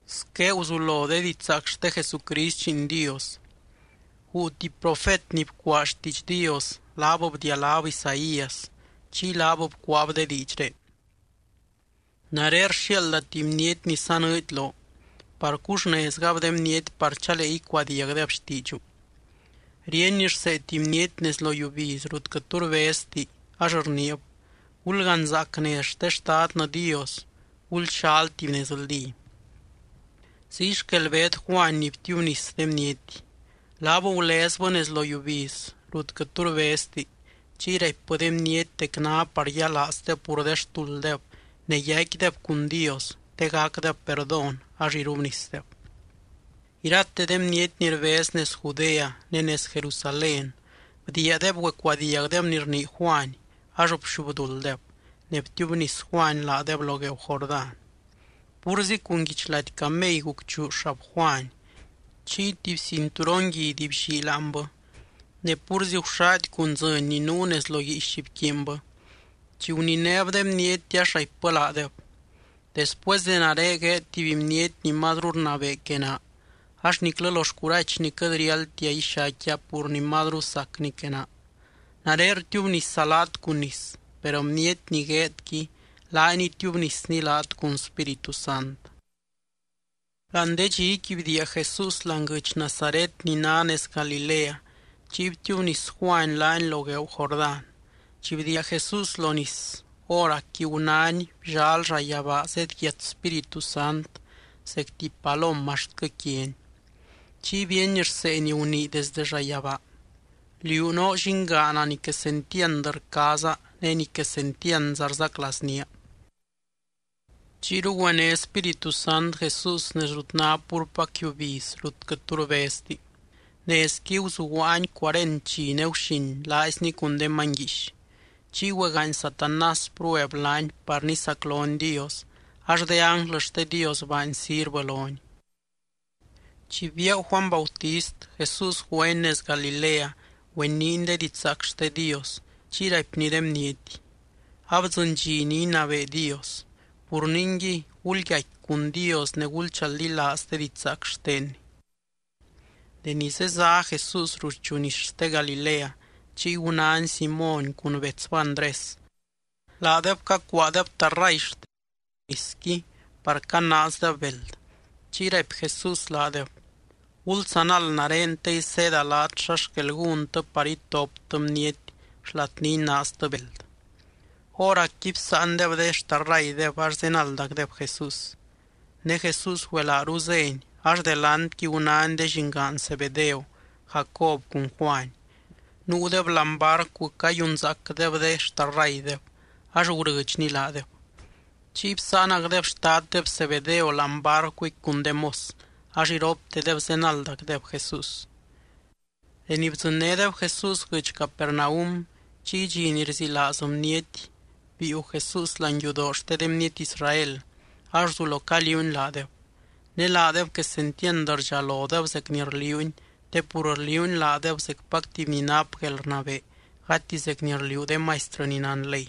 Squé guzulo de didxzaac xte Jesucrist Lliin Dios. Guu tuby profet ni bcuaa xtiidx Dios, laab bdialáb Isaías. Chiy laab bcuaab de diidxré: Nare rxiaalda tuby bniety ni sanɨɨdy loo par cuxnezgab de bniety par chalee icuadiagdeb xtiidxu. Ríeny rsee tuby bniety nez lo yiubiz rut quɨt tu rbezti ax rniib: “Gulganzaac nez xte Xtadnɨ Dios. Gulxal tuby nezldí.” Ziy xquel beed Juany ni btiubnis de bniety. Laab gulezbɨ nez lo yiubiz rut quɨt tu rbezti. Chiy raipbɨ de bniety dec ná par yialaazdeb pur de xtulddeb ne yaicquideb cun Dios te gacdeb perdón ax irubnisdeb. Irate de bniety ni rbez nez Judea ne nez Jerusalén bdiiadeb güecuadiagdeb ni rnii Juany ax bxubdulddeb. Ne btiubnis Juany laadeb lo gueeu Jordán. Púrzi cun guichlady camey gucchuu xab Juany. Chiy tuby cinturon guidy bllii láanbɨ. Ne púrzi guxady cun dzɨny ni nuu nez lo guiix bquiinbɨ. Chi guninéb de bniety ax raipbɨ laadeb: —Después de nare gueed tuby bniety ni mazru rnabee que naa, ax niclɨ lo xcurachny quɨt riáldtia ixaicquia pur ni mazru sacny que naa. Nare rtiubnisa laat cun nis, per bniety ni gueedqui laany itiubnisny laat cun Spíritu Sant. Láani de dxiqui bdiia Jesús láani guɨdx Nazaret ni ná nez Galilea. Chiy btiubnis Juany laany lo gueeu Jordán. Chi bdiia Jesús lo nis, hóracqui gunány bllal llayabaa zedyiat Spíritu Sant zec tuby palom axtquɨ quiany. Chiy bíeny rsee ni gunii desde llayabaa: —Liú noo Llingaana ni quesentiand rcaaza ne ni quesentiandza rzaclaaznía. Chiyru güené Spíritu Sant Jesús nez rut ná púrpac yiubiz rut quɨt tu rbezti. Nezqui guzuguaany cuarent dxi ne guxin laaizny cun de many guiix. Chiy güegaany Satanás prueb laany par nisaclony Dios, ax de ánglɨ xte Dios baany sirvɨ lony. Chi biaagu Juany Bautist, Jesús güeny nez Galilea güeniiny de didxzaac xte Dios. Chiy raipny de bniety: —Abdzɨny dxi ni inabee Dios. Pur ningui, gulyaicqui cun Dios ne gulchaldilaaz de didxzaac xtenny. Deni zezá Jesús ruxchu nis xte Galilea, chiy gunány Simóny cun betsbɨ Andrés. Laadeb cacuaadeb tarray xtendeb lo nisqui par canaazdeb beld. Chiy raipy Jesús laadeb: —Gulzanald nare te iseeda laat xa xquel gúntɨ par itoptɨ bniety xlat ni inaaztɨ beld. Hóracqui bsáandeb de xtarraydeb ax zenaldacdeb Jesús. Ne Jesús güelaaru zény, ax delantqui gunány de llingaan Zebedeo, Jacob cun Juany. Nuudeb láani barcu cayunzaacdeb de xtarraydeb ax gurɨdxny laadeb. Chiy bsáanacdeb xtaddeb Zebedeo láani barcuqui cun de mos. Ax iroptedeb zenaldacdeb Jesús. Deni bdzɨnnédeb Jesús guɨdx Capernaum, chiy dxi ni rzilaaz bniety biiu Jesús láani yudoo xte de bniety Israel ax guzulo caliuuny laadeb. Ne laadeb quesentiand rdxalodeb zec ni rliuuny, te pur rliuuny laadeb zecpac tuby ni nap guelrnabee gati zec ni rliuu de maistrɨ ni nán ley.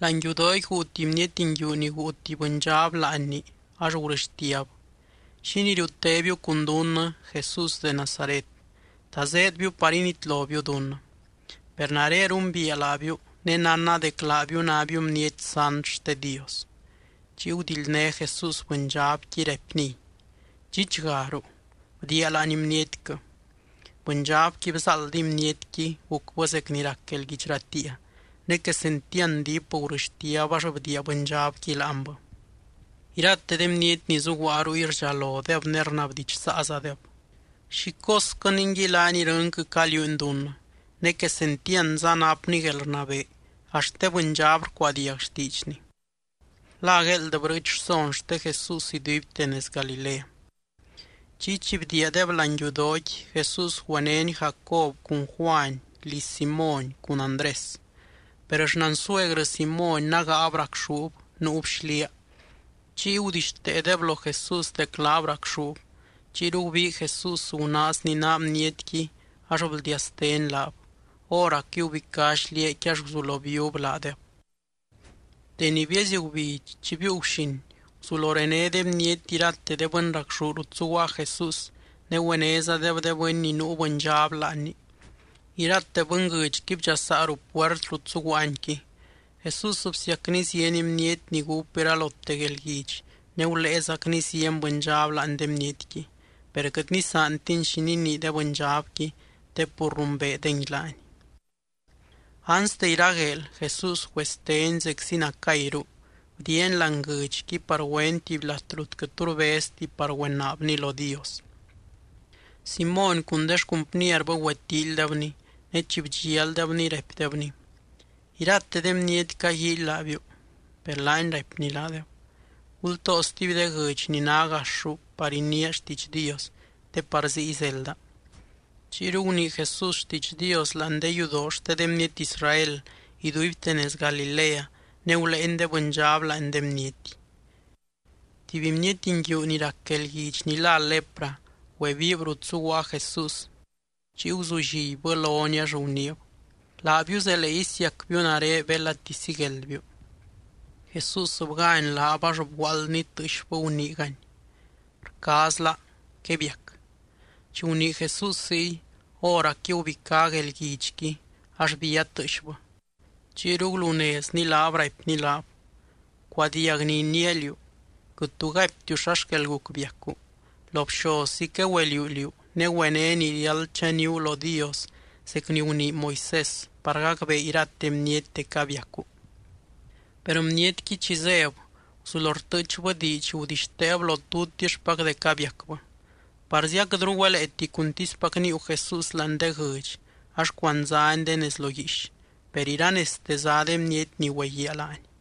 Láani yudooqui guu tuby bniety nguiu ni guu tuby bɨndxab láanni ax gurɨxtiab: —¿Xínii riutébiu cun dunnɨ, Jesús de Nazaret? ¿Ta zéedbiu par initlobiu dunnɨ? Per nare rumbiia laabiu, ne nánna dec laabiu nábiu Bniety sant xte Dios. Chiy gudildné Jesús bɨndxabqui raipniy: —¡Dxichgaruu! ¡Bdiia láani bnietquɨ! Bɨndxabqui bzáaldiy bnietqui gucbɨ zec ni rac guelguidx ratiia, ne quesentiand diip gurɨxtiab ax bdiia bɨndxabqui láanbɨ. Irate de bniety ni zuguaa ruy rdxalodeb ne rnabdidxsaazadeb: —¿Xi cosquɨ ningui laany irɨnquɨ caliuuny dunnɨ? Ne, ¡quesentiandza napny guelrnabee, axt de bɨndxab rcuadiag xtiidxny! La gueeld brɨɨch rson xte Jesús iduibte nez Galilea. Chiy chi bdiiadeb láani yudooqui, Jesús güenény Jacob cun Juany liz Simóny cun Andrés. Per xnansuegrɨ Simóny nágaab racxúb. Nuub xliaa. Chiy gudixteedeb lo Jesús dec laab racxúb. Chiyru gubii Jesús gunaazny naa bnietqui ax bldiasteny laab. Hóracqui gubicá xliaaqui ax guzulo bíub laadeb. Deni bieezy gubidx chi biiu guxin, guzulo rené de bniety irate de bɨny racxú rut zuguaa Jesús ne güenézadeb de bɨny ni nuu bɨndxab láanni. Irate bɨnguɨdxqui bdxasaa ruu puert rut zuguaanyqui. Jesús bsiacny zieny bniety ni gúp iralote guelguidx ne guléezacny zieny bɨndxab láani de bnietqui. Per quɨt nisaantiny xi ninii de bɨndxabqui te pur rumbeedengui laany. Anste iragueel, Jesús güesteny zeczi nacayru. Bdiiany láani guɨdxqui par güeny tuby lat rut quɨt tu rbezti par güenaabny lo Dios. Simóny cun de xcumpnierbɨ güetíilydebny. Ne chi bdxialdebny, raipdebny: —Irate de bniety caguíily laabiu. Per laany raipny laadeb: —Gultoo stuby de guɨdx ni ná gaxru par iniia xtiidx Dios te par ziy zelda. Chiyru gunii Jesús xtiidx Dios láani de yudoo xte de bniety Israel iduibte nez Galilea ne guléeny de bɨndxab láani de bniety. Tuby bniety nguiu ni rac guelguidx ni lá lepra güebiib rut zuguaa Jesús. Chiy guzullibbɨ lony ax guniib: —Laabiu zelee isiacbiu nare belati sigueldbiu. Jesús bgány laab ax bguaaldny tɨɨxbɨ guniigany: —Rcaazla. Quebiac. Chi gunii Jesús ziy, hóracqui gubicá guelguidxqui ax bía tɨɨxbɨ chiyru gulunezny laab, raipny laab: —Bcuadiag ni iniia liú. Quɨt tu gaiptiu xa xquel guc biacu. Lo bxozzi quegüeliuu liú, ne güené ni riáld chaníu lo Dios zec ni gunii Moisés, par gacbee irate bniety dec abiacu. Per bnietqui chi zéb, guzulo rtɨɨchbɨ diidx, gudixteeb lo tutixpac dec abiacbɨ. Parzi aquɨtru güeleeti cuntispac níiu Jesús láani de guɨdx ax cuandzány de nez lo guiix. Per iranezte zá de bniety ni güeguiaa laany.